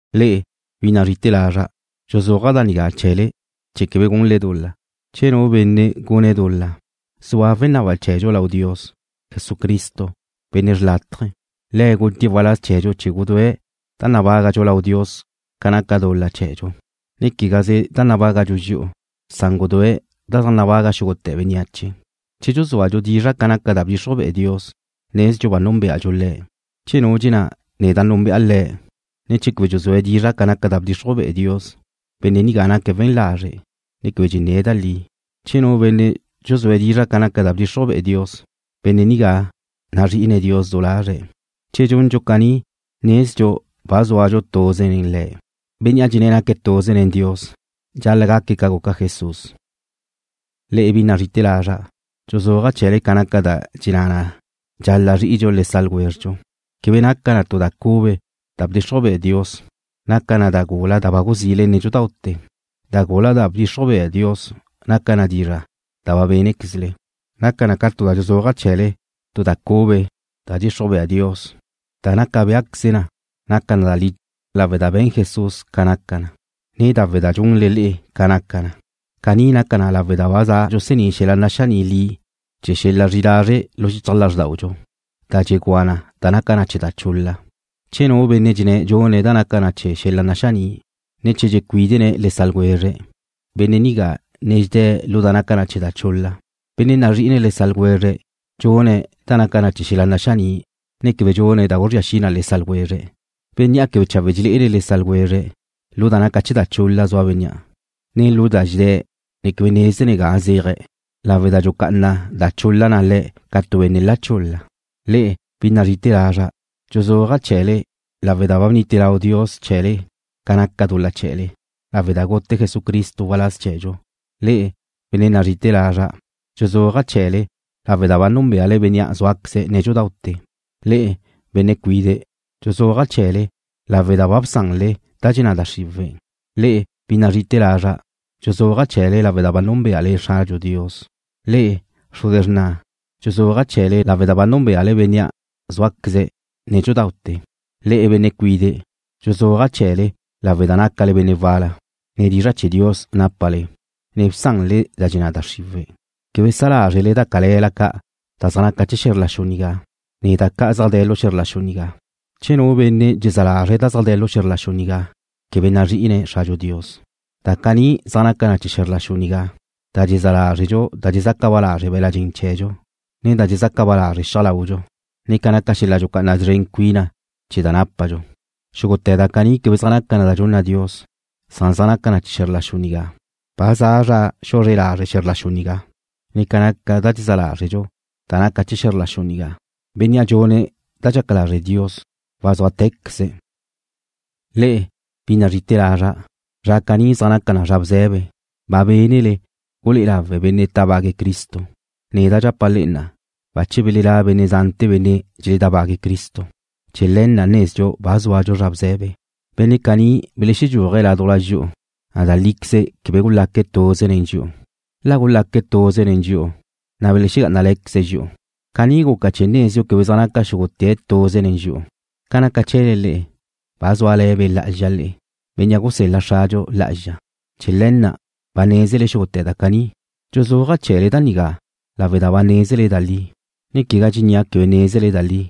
Le'e, bi nazri'ite̱ lazra', dxuzúaja' da nigá chee̱le chee̱ quebe gunle dul-la. Che nu benne' gune̱' dul-la, zua wenaba chee̱dxu lau Dios, Jesucristo, Benne' xlátaje̱. Le̱' gutie̱' waláz chee̱dxu chee̱ gudúe̱' da nabágadxu lau Dios ca naca dul-la chee̱dxu, ne quegaze da nabágadxu dxi'u, san gudúe̱' da zaj nabaga xúgute̱ bénneache. Che dxuzúadxu dizra' ca naca da bdxixruj be'e Dios, nezdxu ba núnbeadxu Le̱'. Che nu dxenná: Neda' núnbe'a Le̱', ne che quebe dxuzúe̱' dizra' ca naca da bdxixruj be'e Dios, benne' nigá naque̱' we̱n lazre', ne quebe dxenné̱' da li. Che nu benne' dxuzúe̱' dizra' ca naca da bdxixruj be'e Dios, benne' nigá nazri'ine̱' Dios du lazre̱'. Che dxundxu caní nezdxu ba zúadxu tuze nen Le̱'. Bénnea' dxenné̱' naque̱' tuze nen Dios dxal-la' gaque̱' ca guca Jesús. Le'e, bi nazrí'ite̱ lazra', dxuzúaja' chee̱le ca naca da dxenná na dxal-la' zri'idxu le sa' ljwézredxu. Quebe naca na tu da cube da bdxixruj bea Dios. Naca na da gula na' da ba guzile nédxudaute̱. Da gula da bdxixruj bea Dios naca na dizra' da ba bénequezle. Naca na ca dxuzúaja' chee̱le tu da cube da dxixruj bea Dios, da naca béaqueze na naca da li lawe' da be̱n Jesús ca naca na, ne lawe' da dxunle le'e ca naca na. Caní naca na lawe' da ba dxusení' xel-la' naxaní' li chee̱ xel-la' zri'i lazre' lu xichaj lázrdaudxu, da dxegúa na da naca na chee̱ da chul-la. Che nu benne' dxenné̱' dxune̱' da naca na chee̱ xel-la' naxaní', ne che dxecuídene̱' le sa' ljwezre̱', benne' nigá ne dxedé̱' lu da naca na chee̱ da chul-la. Benne' nazri'ine̱' le sa' ljwezre̱' dxune̱' da naca chee̱ xel-la' naxaní', ne quebe dxune̱' da guzría xi na le sa' ljwezre̱'. Bénnea' quebe chawe' dxelé'ene̱' le sa' ljwezre̱', lu da naca na chee̱ da chul-la zua bénnea', ne lu da na' dxedé̱', ne quebe nézene̱' ga zéaje̱' lawe' da dxucá'ana da chul-la le̱' ca tu benne' la chul-la. Le'e, bi nazri'ite̱ lazra', dxuzúaja' chee̱le lawe' da ba bnite lau Dios chee̱le ca naca dul-la chee̱le, lawe' da gute Jesucristo waláz chee̱dxu. Le'e, benne' nazri'ite̱ lazra', dxuzúaja' chee̱le lawe' da ba núnbeale Bénnea' zúaqueze̱' nédxudaute̱. Le'e, benne' cuide', dxuzúaja' chee̱le lawe' da ba bsanle da dxenná da xriwe̱'. Le'e, bi nazri'ite̱ lazra', dxuzúaja' chee̱le lawe' da ba núnbeale Xradxu Dios. Le'e, xruze xrna', dxuzúaja' chee̱le lawe' da ba núnbeale Bénnea' zúaqueze̱' nédxudaute̱. Le'e, benne' cuide', dxuzúaja' chee̱le lawe' da nácale benne' wal-la, ne dizra' chee̱ Dios nápale, ne bsanle da dxenná da xriwe̱'. Quebe sa lázrele da cale̱la ca' da zaj naca na chee̱ xe̱zr la xu nigá, ne quegá da zaj de̱ lu xe̱zr la xu nigá. Che nu benne' dxezá lazre̱' da zaj de̱ lu xe̱zr la xu nigá, quebe nazri'ine̱' Xradxu Dios. Da caní zaj naca na chee̱ xe̱zr la xu nigá, da dxezá lázredxu da dxezaca ba lazre' be̱la' dxen chee̱dxu, ne da dxezaca ba lazre' xiaj laudxu, ne ca naca xel-la' dxucá'ana szren cuina chee̱ da nápadxu. Xúgute̱ da caní quebe zaj naca na da dxunna Dios, san zaj naca na chee̱ xe̱zr la xu nigá. Ba za zra xuzre lazre' xe̱zr la xu nigá, ne ca naca da dxezá lázredxu da naca na chee̱ xe̱zr la xu nigá. Bénnea' dxune̱' da dxaca lazre' Dios wazúatecaze̱'. Le'e, bi nazri'ite̱ lazra', zra caní zaj naca na zra bze̱be. Ba bénele gulé'e lawe̱' benne' tábague̱' Cristo. Neda' dxapa' le'e na'a, bache belelá' benne' zante̱ benne' dxeledábague̱' Cristo. Chee̱ le̱ na' nezdxu ba zúadxu zra bze̱be. Benne' caní belexedxúajqueze̱' ládujla dxi'u. Da líqueze quebe gulaque̱' tuze nen dxi'u. La gulaque̱' tuze nen dxi'u, na' belexegá'anale̱queze̱' dxi'u. Caní guca chee̱ nezdxu quebe zaj naca xúgute̱' tuze nen dxi'u. Ca naca chee̱le le'e, ba zúale̱ Be' Lá'azxa le'e, Bénnea' gusel-la Xradxu Lá'azxa. Chee̱ le̱ na' ba nézele xúgute̱ da caní. Dxuzúaja' chee̱le da nigá lawe' da ba nézele da li, ne quegá dxennia' quebe nézele da li.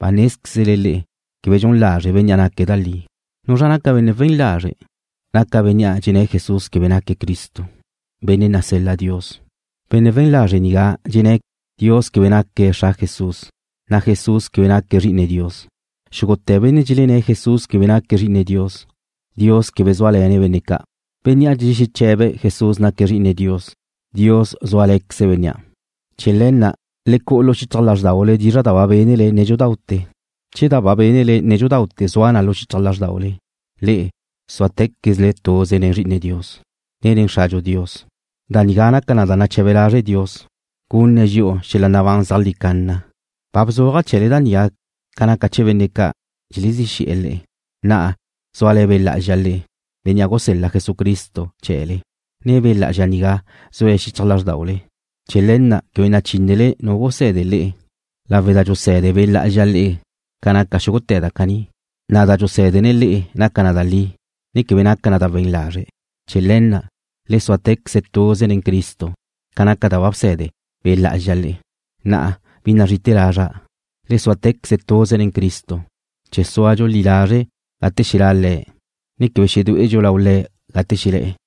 Ba nézquezle le'e quebe dxun lazre' Bénnea' naque̱' da li. ¿Nuzra' naca benne' we̱n lazre'? Naca bénnea' dxenné̱' Jesús quebe naque̱' Cristo, Benne' nasel-la Dios. Benne' we̱n lazre' nigá dxenné̱' Dios quebe naque̱' Xra Jesús, ne Jesús quebe naque̱' Zri'ine Dios. Xúgute̱ benne' dxelenné̱' Jesús quebe naque̱' Zri'ine Dios, Dios quebe zúale̱ne̱' benne' ca'. Bénnea' dxexeche̱be̱' Jesús naque̱' Zri'ine Dios, Dios zúale̱queze̱' bénnea'. Chee̱ le̱ na', le cu'u lu xichaj lázrdaule dizra' da ba bénele nédxudaute̱. Che da ba bénele nédxudaute̱ zua na lu xichaj lázrdaule, le'e súatequezle tuze nen Zri'ine Dios, ne nen Xradxu Dios. Da nigá naca na da nache̱be lazre' Dios, gunne̱' dxi'u xel-la' nabán zeajlí canna. Ba bzuaja' chee̱le da nigá ca naca chee̱ benne' ca' dxelezí xe̱'e̱ le'e. Na'a zúale̱ Be' Lá'azxa le'e, Bénnea' gusel-la Jesucristo chee̱le, na' Be' Lá'azxa nigá zue̱' xichaj lázrdaule. Chee̱ le̱ na' quebe nachínele nu guse̱de le'e lawe' da dxuse̱de Be' Lá'azxa le'e ca naca xúgute̱ da caní, na' da dxusé̱dene̱' le'e naca na da li, ne quebe naca na da we̱n lazre'. Chee̱ le̱ na', le súatequeze tuze nen Cristo ca naca da ba bse̱de Be' Lá'azxa le'e. Na'a, bi nazri'ite̱ lazra', le súatequeze tuze nen Cristo, chee̱ súadxu li lazre' gate xelá' Le̱', ne quebe xedué'edxu lau Le̱' gate xelé̱'e̱.